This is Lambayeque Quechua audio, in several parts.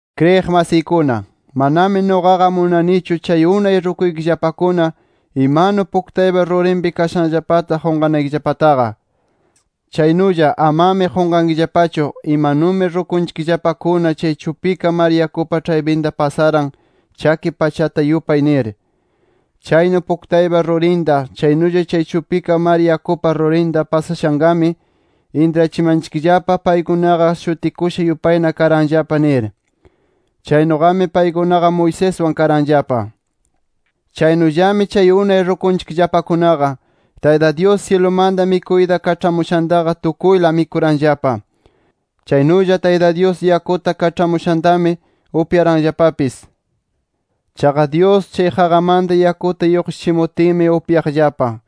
Kriyiq masiykuna, manami nuqaqa munanichu, chay unay rukunchikllapakuna imanu, puktaypa rurinpi kashanllapata qunqanaykillapataqa. Chaynulla amami qunqankillapachu imanumi rukunchikllapakuna chay chupika mar yakupa ĉhaypinta pasaran, chaki pachata yupay nir. Chaynu puktaypa rurinta, chaynulla chay chupika mar yakupa rurinta pasashanqami, intrachimanchikllapa paykunaqa shutikusha yupayna karanllapa nir. Chaynuqami paykunaqa Moiseswan karanllapa. Chaynullami chay unay rukunchikllapakunaqa, Tayta Dyus syilumanta mikuyta kaĉhamushantaqa tukuyla mikuranllapa. Chaynulla Tayta Dyus yakuta kaĉhamushantami, upyaranllapapis. Chaqa Dyus, chay qaqamanta yakuta lluqshichimutinmi upyaqllapa.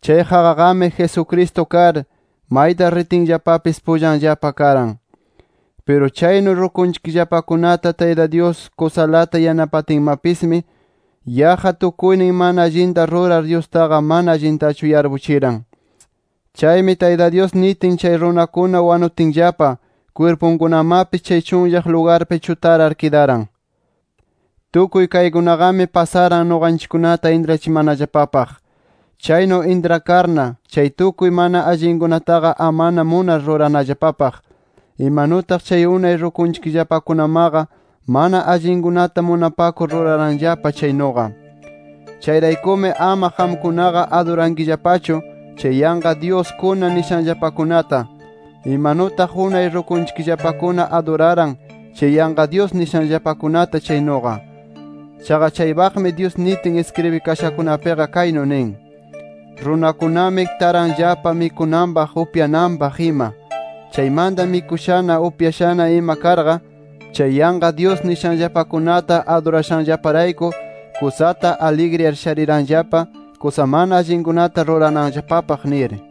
Chay qaqaqami Jesucristo kar, mayta ritinllapapis pullanllapa karan. Piru chaynu rukunchikllapakunata Tayta Dyus kusalata yanapatinmapismi, yaqqa tukuynin mana allinta rurar, Dyustaqa mana allintachu yarpuchiran. Chaymi Tayta Dyus nitin chay runakuna wanutinllapa, kwirpunkunamapis chay chunllaq lugarpi chutarar kidaran. Tukuy kaykunaqami pasaran nuqanchikkunata intrachimanallapapaq. Chaynu intrakarna, chay tukuy mana allinkunataqa amana munar rurananllapapaq, imanutaq chay unay rukunchikllapakunamaqa mana allinkunata munapakur ruraranllapa chaynuqa. Chayraykumi, ama qamkunaqa adurankillapachu chay yanqa dyuskuna nishanllapakunata, imanutaq unay rukunchikllapakuna aduraran chay yanqa dyus nishanllapakunata chaynuqa. Chaqa chaypaqmi Dyus nitin iskribikashakunapiqa kaynu nin: “Runakunami taranllapa mikunanpaq, upyananpaq ima. Chaymanta mikushana, upyashana ima karqa, chay yanqa dyus nishanllapakunata adurashanllaparayku, kusata aligriyar shariranllapa kusa mana allinkunata rurananllapapaq” nir.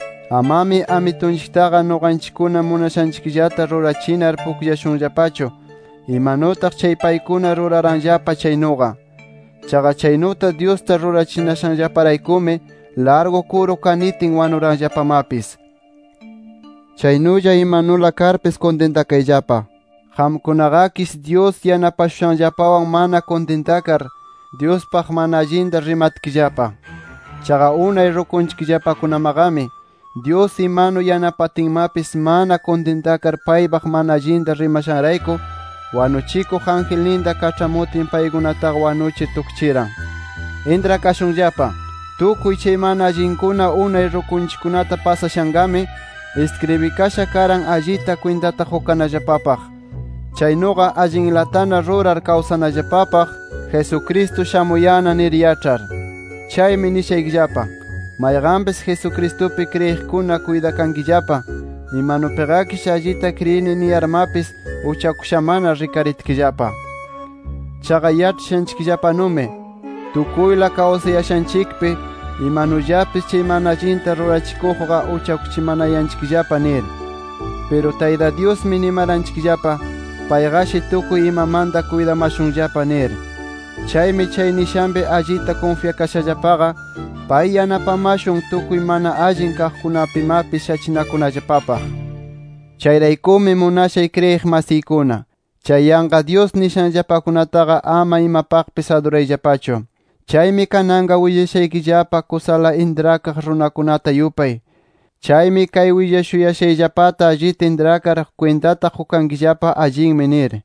Amami Amitunchiktaqa nuqanchikkuna munashanchikllata rurachinar pukllashunllapachu, imanutaq chay paykuna ruraranllapa chaynuqa. Chaqa chaynuta, Dyusta rurachinashanllaparaykumi, largu kuru kanitin wanuranllapamapis. Chaynulla imanula karpis kuntintakayllapa. Qamkunaqakish Dyus yanapashushanllapawan mana kuntintakar, Dyuspaq mana allinta rimatkillapa. Chaqa unay rukunchikllapakunamaqami, Dyus imanu yanapatinmapis, mana kuntintakar paypaq mana allinta rimashanrayku, wanuchikuq angelninta kaĉhamutin paykunataqa wanuchir tukchiran. Intrakashunllapa: Tukuy chay mana allinkuna unay rukunchikkunata pasashanqami, iskribikasha karan allita kwintata qukanallapapaq. Chaynuqa, allinlatana rurar kawsanallapapaq Jesucristo shamuyanna nir yaĉhar. Chaymi nishaykillapa: Mayqanpis Jesucristupi kriyiqkuna kuytakankillapa, imanupiqakish allita kriyini niyarmapis uchakushamana rikaritkillapa. Chaqa yaĉhashanchikllapanumi, tukuyla kawsayashanchikpi imanullapis chay mana allinta rurachikuqqa uchakuchimanayanchikllapa nir. Piru Tayta Dyusmi nimaranchikllapa, payqashi tukuy imamanta kuytamayashunllapa nir. Chaymi chay nishanpi allita kunfyakashallapaqa, pay yanapamashun, tukuy mana allin kaqkunapimapis shachinakunallapapaq. Chayraykumi munashay kriyiq masiykuna, chay yanqa dyus nishanllapakunataqa ama imapaqpis adurayllapachu. Chaymi kananqa willashaykillapa kusala intrakaq runakunata yupay. Chaymi kay willashuyashayllapata allita intrakar, kwintata qukankillapa allinmi nir.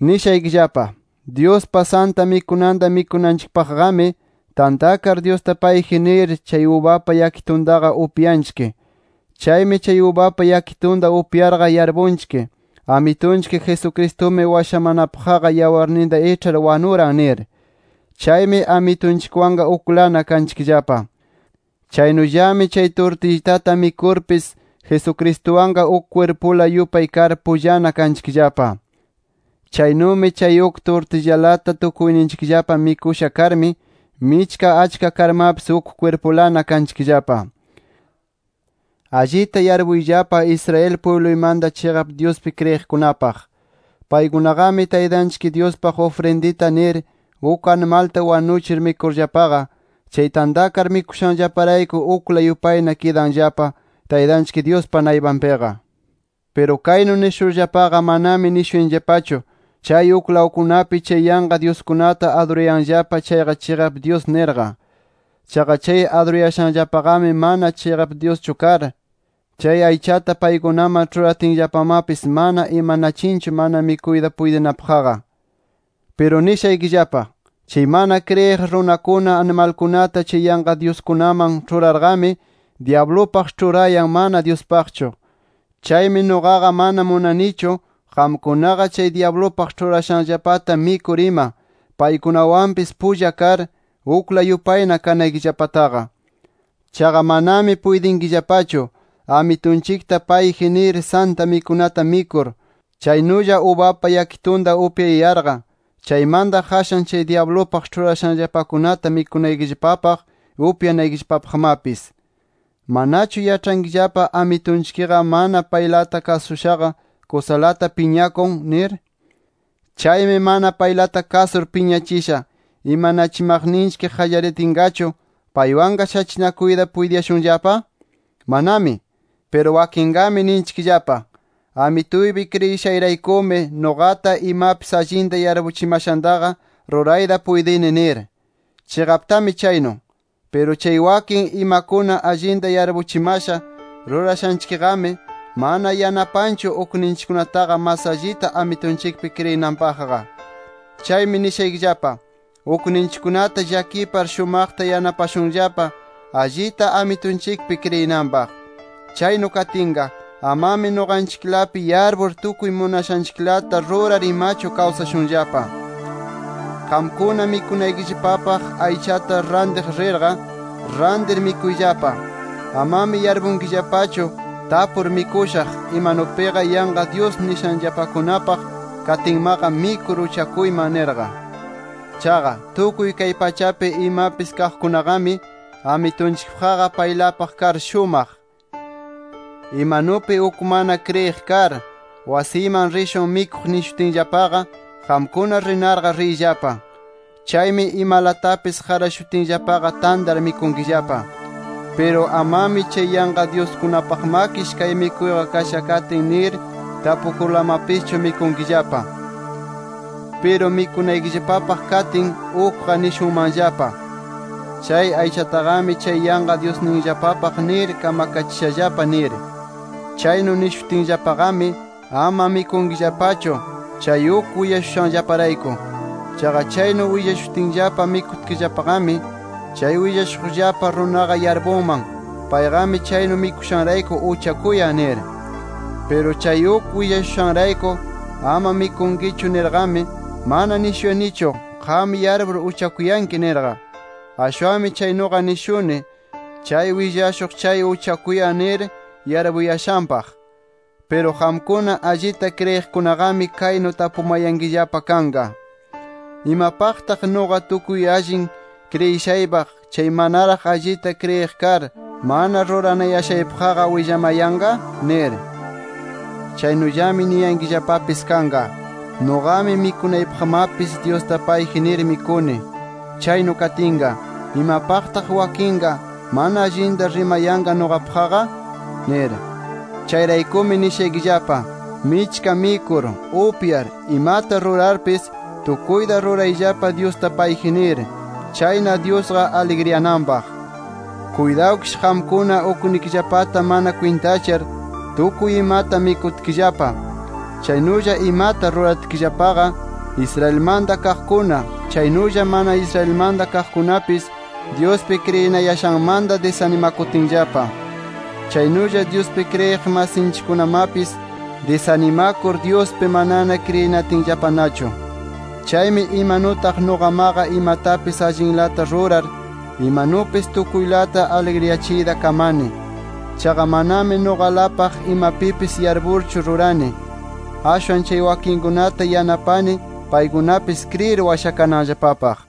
Nishaykillapa: Dyuspaq Santa Mikunata mikunanchikpaqqami, tantakar Dyusta payji nir chay ubapa yakituntaqa upyanchik. Chaymi chay ubapa yakitunta upyarqa yarpunchik: Amitunchik Jesucristumi washamanapaqqa yawarninta iĉhar wanuran nir. Chaymi Amitunchikwanqa uklana kanchikllapa. Chaynullami chay turtillitata mikurpis Jesucristuwanqa uk kwirpula yupay kar, pullana kanchikllapa. Chaynumi chay uk turtillalata tukuyninchikllapa mikusha karmi, michka achka karmapis, uk kwirpulana kanchikllapa. Allita yarpuyllapa Israel pwibluymanta chiqap Dyuspi kriyiqkunapaq. Paykunaqami Taytanchik Dyuspaq ufrindita nir uk animalta wanuchir mikurllapaqa, chay tantakar mikushanllaparayku ukla yupayna kidanllapa, Taytanchik Dyuspa naypanpiqa. Piru kaynu nishurllaqa manami nishuyanillapachu, chay uklawkunapi chay yanqa dyuskunata adurayanllapa chayqa chiqap dyus nirqa. Chaqa chay adurayashanllapaqami, mana chiqap dyuschu kar, chay aychata paykunaman ĉhuratinllapamapis, mana imanachinchu mana mikuyta puytinapaqqa. Piru nishaykillapa: Chay mana kriyiq runakuna animalkunata chay yanqa dyuskunaman ĉhurarqami, dyablupaq ĉhurayan, mana Dyuspaqchu. Chaymi nuqaqa mana munanichu qamkunaqa chay dyablupaq ĉhurashanllapata mikur ima, paykunawanpis pulla kar, ukla yupayna kanaykillapataqa. Chaqa manami puytinkillapachu, Amitunchikta payji nir Santa Mikunata mikur, chaynulla ubapa yakitunta upyayarqa, chaymanta qashan chay dyablupaq ĉhurashanllapakunata mikunaykillapapaq, upyanaykillapapaqmapis. ¿Manachu yaĉhankillapa, Amitunchikqa mana paylata kasushaqa kusalata piñakun? nir. ¿Chaymi mana paylata kasur piñachisha, imanachimaqninchik qallaritinqachu paywanqa shachinakuyta puytiyashunllapa? ¡Manami! Piru wakinqami ninchikllapa: Amituypi kriyishayraykumi nuqata imapis allinta yarpuchimashantaqa rurayta puytini nir. Chiqaptami chaynu. Piru chay wakin imakuna allinta yarpuchimasha rurashanchikqami, mana yanapanchu ukninchikkunataqa mas allita Amitunchikpi kriyinanpaqqa. Chaymi nishaykillapa: Ukninchikkunata llakipar shumaqta yanapashunllapa allita Amitunchikpi kriyinanpaq. Chaynu katinqa, amami nuqanchiklapi yarpur tukuy munashanchiklata rurar imachu kawsashunllapa. Qamkuna mikunaykillapapaq aychata rantiq rirqa, rantir mikuyllapa. Amami yarpunkillapachu, tapur mikushaq imanupiqa yanqa dyus nishanllapakunapaq katinmaqa mikur uchakuyman nirqa. Chaqa, “Tukuy kay pachapi imapis kaqkunaqami, Amitunchikpaqqa paylapaq kar shumaq”. Imanupi uk mana kriyiq kar, wasiyman rishun mikuq nishutinllapaqa, qamkuna rinarqa riyllapa. Chaymi imalatapis qarashutinllapaqa tantar mikunkillapa. Piru amami chay yanqa dyuskunapaqmakish kay mikuyqa kasha katin nir tapukurlamapischu mikunkillapa. Piru mikunaykillapapaq katin, ukqa nishunmanllapa: Chay aychataqami chay yanqa dyusninllapapaq nir kamkachishallapa nir. Chaynu nishutinllapaqami, ama mikunkillapachu, chay uk willashushanllaparayku. Chaqa chaynu willashutinllapa mikutkillapaqami, chay willashuqllapa runaqa yarpunman payqami chaynu mikushanrayku uchakuyan nir. Piru chay uk willashushanrayku ama mikunkichu nirqami, mana nishuyanichu, qam yarpur uchakuyanki nirqa. Ashwanmi chaynuqa nishuni, chay willashuq chay uchakuyan nir yarpuyashanpaq. Piru qamkuna allita kriyiqkunaqami kaynu tapumanayankillapa kanqa: ¿Imapaqtaq nuqa tukuy allin nir kriyishaypaq, chay manaraq allita kriyiq kar, mana ruranayashanpaqqa willamanqa? nir. Chaynullami niyankillapapis kanqa: Nuqami mikunaypaqmapis Dyusta payji nir mikuni. Chaynu katinqa, ¿imapaqtaq wakinqa mana allinta rimayanqa nuqapaqqa? nir. Chayraykumi nishaykillapa: Michka mikur, upyar, imata rurarpis, tukuyta rurayllapa Dyusta payji nir. Chayna Dyusqa aligriyananpaq. Kuytawkish qamkuna uknikillapata mana kwintachar tukuy imata mikutkillapa, chaynulla imata ruratkillapaqa, Israelmanta kaqkuna, chaynulla mana Israelmanta kaqkunapis Dyuspi kriyinayashanmanta disanimakutinllapa. Chaynulla Dyuspi kriyiq masinchikkunamapis disanimakur Dyuspi manana kriyinatinllapanachu. Chaymi imanutaq nuqamaqa imatapis allinlata rurar, imanupis tukuylata aligriyachiyta kamani. Chaqa manami nuqalapaq imapipis yarpurchu rurani, ashwan chay wakinkunata yanapani paykunapis kriyir washakananllapapaq.